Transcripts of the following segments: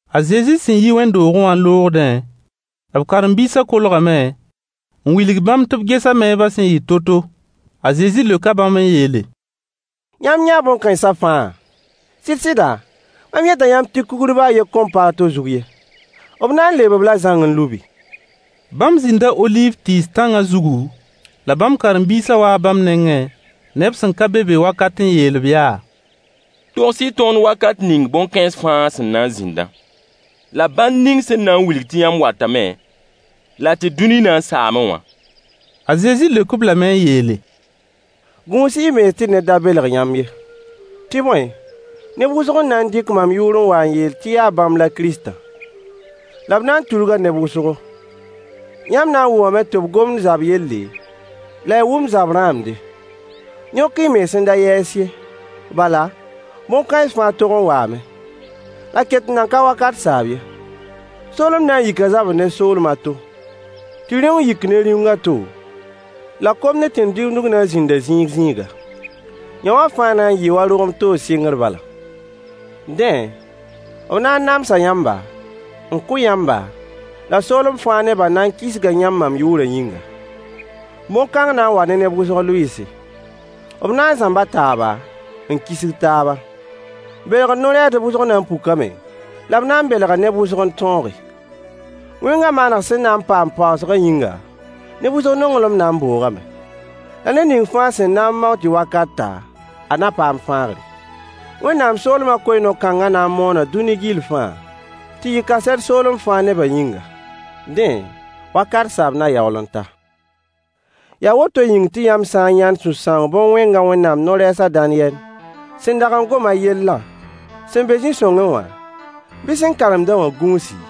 A Zezi sẽn yi wẽnd-doogẽ wã n loogdẽ, b karen-biisã kolgame n wilg bãmb tɩ b ges a meebã sẽn yɩ to-to. A Zezi leoka bãmb n yeele: Yãmb yãa bõn-kãensã fãa? Sɩd-sɩda, mam yeta yãmb tɩ kugr baa a yen kõn pa a to zug ye. B na n leeb-b-la zãng n lubi. Bãmb zĩnda oliiv tɩɩs tãngã zugu, la bãmb karen-biisã waa bãmb nengẽ neb sẽn ka be be wakat n yeel-b yaa: Togs-y tõnd wakat ning bõn-kãens fãa sẽn na n zĩndã, la bãnd ning sẽn na n wilg tɩ yãmb watame la tɩ dũni na n saame wã. A Zezi leok-b lame n yeele: Gũus-y y mens tɩ ned da belg yãmb ye. Tɩ bõe, neb wʋsg n na n dɩk mam yʋʋr n wa n yeel tɩ yaa bãmb la Kiristã. La b na n tudga neb wʋsgo. Yãmb na n wʋmame tɩ b gomd zab yelle, la y wʋm zab rãamde. Yõk-y y mens n da yɛɛs ye, bala, bõn-kãens fãa tog n waame. La ket n nan ka wakat saab ye. Soolem na n yika zabr ne soolem a to, tɩ rĩung yik ne rĩung a to, la kom ne tẽn-digimdg na n zĩnda zĩig-zĩiga. Yõwã fãa na n yɩɩ wa rogem toog sɩngr bala. Dẽ, b na n namsa yãmba, n kʋ yãmba, la soolem fãa nebã na n kisga yãmb mam yʋʋrã yĩnga. Bõn-kãng na n waa ne neb wʋsg lʋɩɩse. B na n zãmba taaba, n kisg taaba. Belgr no-rɛɛsdb wʋsg na n pukame la b na n belga neb wʋsg n tõoge. Wẽngã maaneg sẽn na n paamd paoosgã yĩnga, neb wʋsg nonglem na n boogame. La ned ning fãa sẽn na n mao-a tɩ wakat ta, a na paam fãagre. Wẽnnaam soolmã koe-no-kãngã na n moona dũni gill fãa, tɩ yɩ kaset soolem fãa nebã yĩnga. Dẽ, wakat saab na yaool n ta. Yaa woto yĩng tɩ yãmb sã n yãnd sũ-sãoong bõn-wẽngã Wẽnnaam no-rɛɛs a Daniyɛl sẽn dag n gom a yellã sẽn be zĩ-sõngẽ wã, bɩ sẽn karemd-a wã gũusi,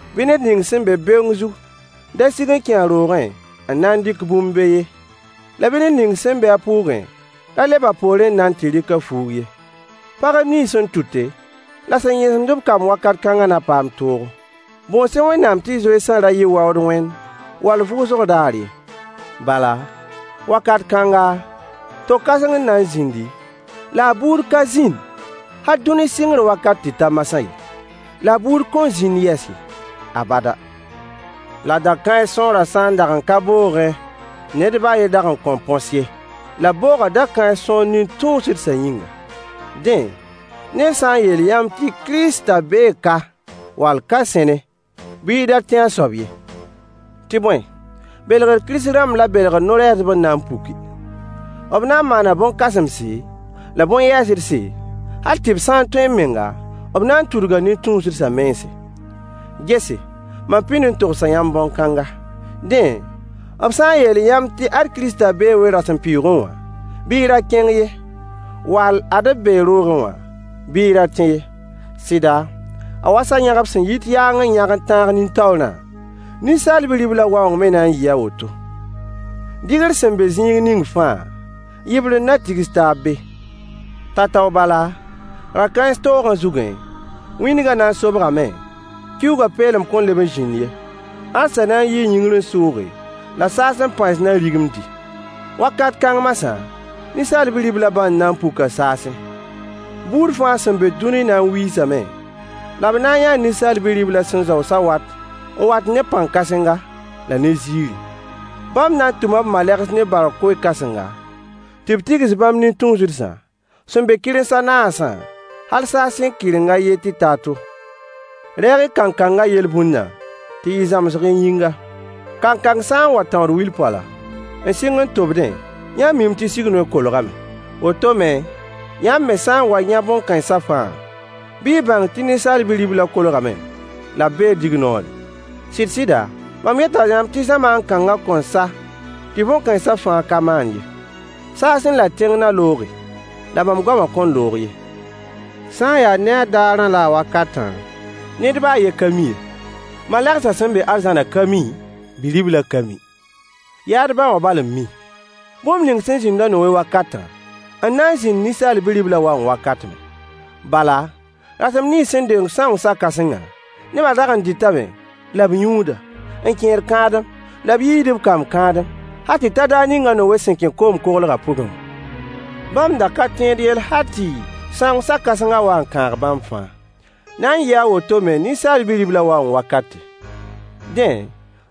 bɩ ned ning sẽn be beoong zug da sig n kẽ a roogẽ n na n dɩk bũmb be ye, la bɩ ned ning sẽn be a pʋʋgẽ ra leb a poorẽ n na n tɩ rɩk a fuug ye. Pagb nins sẽn tʋte la sẽn yẽsemd kamb wakat kãngã na paam toogo. Bõos-y Wẽnnaam tɩ y zoeesã ra yɩ waood wẽnd wall vʋʋsg daar ye. Bala, wakat kãnga, to-kãseng n na n zĩndi, la a buud ka zĩnd hal dũni sɩngr wakat tɩ ta masã ye, la a buud kõn zĩnd yɛs ye, abada. La da-kãens sõorã sã n dag n ka boogẽ, ned baa a yen dag n kõn põsẽ ye. La b booga da-kãens sõor nin-tũusdsã yĩnga. Dẽ, ned sã n yeel yãmb tɩ Kiristã bee ka wall ka sẽne, bɩ y da tẽ a soab ye. Tɩ bõe, belgr kirist-rãmb la belgr no-rɛɛsdb n na n puki. B na n maana bõn-kãsemse, la bõn-yɛɛsdse, hal tɩ b sã n tõe menga, b na n tudga nin-tũusdsã mense. Gese, mam pĩnd n togsa yãmb bõn-kãnga. Dẽ, b sã n yeel yãmb tɩ “ad Kiristã bee we-rasempʋɩɩgẽ wã,” bɩ y ra kẽng ye, wall “ad b bee roogẽ wã,” bɩ y ra tẽ ye. Sɩda, a wa sa-yãgb sẽn yit yaang n yãg n tãag nin-taoorã, Ninsaal Bi-riblã waoong me na n yɩɩ a woto. Dɩgr sẽn be zĩig ning fãa, yɩbrend na tigs taab be. Tao-tao bala, ra-kãens toogã zugẽ, wĩndgã na n sobgame, kiuugã peelem kõn leb n zĩnd ye, ãdsã na n yii yĩngr n sʋʋge, la saasẽ pãens na rigimdi. Wakat kãng masã, Ninsaal Bi-riblã bãnd na n puka saasẽ. Buud fãa sẽn be dũni na n wiisame, la b na n yãa Ninsaal Bi-riblã sẽn zao sawat n wat ne pãn-kãsenga la ne ziiri. Bãmb na n tʋma b malegs ne baorg koe-kãsenga, tɩ b tigs bãmb nin-tũusdsã sẽn be kɩrems a naasã, hal saasẽ kɩreng a yen tɩ ta a to. Reeg-y kankangã yel-bũndã tɩ yɩ zãmsg y yĩnga. Kankang sã n wa n tãood wil-poala, n sɩng n tobdẽ, yãmb miime tɩ sig-noy kolgame. Woto me, yãmb me sã n wa n yã bõn-kãensã fãa, bɩ y bãng tɩ Ninsaal Bi-riblã kolgame la b bee dignoorẽ. Sɩd sɩda, mam yeta yãmb tɩ zamaan kãngã kõn sa tɩ bõn-kãensã fãa ka maan ye. Saasẽ la tẽng na looge, la mam goamã kõn loog ye. Sã n yaa ne a daarã la a wakatã, ned baa a yen ka mi ye: malegsã sẽn be arzãnã ka mi, Bi-riblã ka mi. Yaa d ba wã bal n mi. Bũmb ning sẽn zĩnd a Nowe wakatã n na n zĩnd Ninsaal Bi-riblã waoong wakat me. Bala, rasem nins sẽn deng sãoong sa-kãsengã, nebã dag n dɩtame la b yũuda, n kẽed kãadem la b yiisd b kamb kãadem, hal tɩ ta daar ning a Nowe sẽn kẽ koom koglgã pʋgẽ wã. Bãmb da ka tẽed yell hal tɩ sãoong sa-kãsengã wa n kãag bãmb fãa. Na n yɩɩ a woto me Ninsaal Bi-riblã waoong wakate. Dẽ,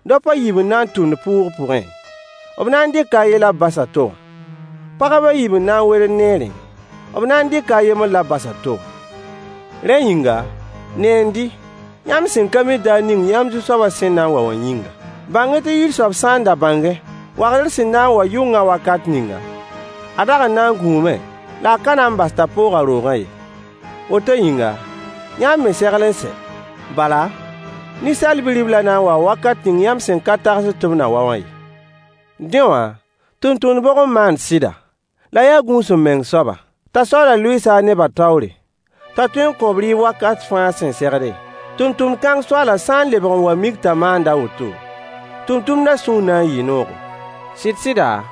daop a yiib n na n tʋmd pʋʋg pʋgẽ: b na n dɩka a yen la b bas a to wã. Pagb a yiib n na n werd neerẽ: b na n dɩka a yembr la b bas a to wã. Rẽ yĩnga, neend-y, yãmb sẽn ka mi daar ning yãmb Zu-soabã sẽn na n wa wã yĩnga. Bãng-y tɩ yir soab sã n da bãngẽ wagdr sẽn na n wa yʋngã wakat ninga, a dag n na n gũume la a ka na n bas-a t'a poog a roogã ye. Woto yĩnga, yãmb me segl n sɛ, bala, Ninsaal Bi-riblã na n waa wakat ning yãmb sẽn ka tagsd tɩ b na wa wã ye. Dẽ wã, tʋmtʋmd bʋg n maand sɩda, la a ya gũus-m-meng soaba, t'a soaalã lʋɩɩs-a a nebã taoore, t'a tõe n kõ-b rɩɩb wakat fãa sẽn segde? Tʋmtʋmd kãng soaalã sã n lebg n wa n mik t'a maanda a woto, tʋmtʋmdã sũur na n yɩɩ noogo. Sɩd-sɩda,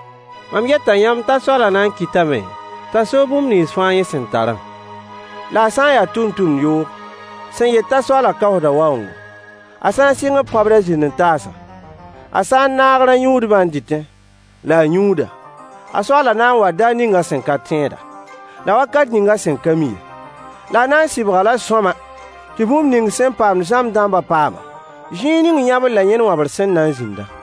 mam yeta yãmb t'a soaalã na n kɩtame t'a soog bũmb nins fãa yẽ sẽn tarã. La a sã n ya tʋmtʋmd yoog sẽn yet t'a soaalã kaoosda waoongo, a sã n sɩng n pãb a zĩnd-n-taasã, a sã n naag rã-yũudbã n dɩtẽ la a yũuda, a soaalã na n waa daar ning a sẽn ka tẽeda, la wakat ning a sẽn ka mi ye. La a na n sɩbg-a-la sõama, tɩ bũmb ning sẽn paamd zãmb dãmbã paam-a, zĩig ning yãbr la yẽn wãbr sẽn na n zĩndã.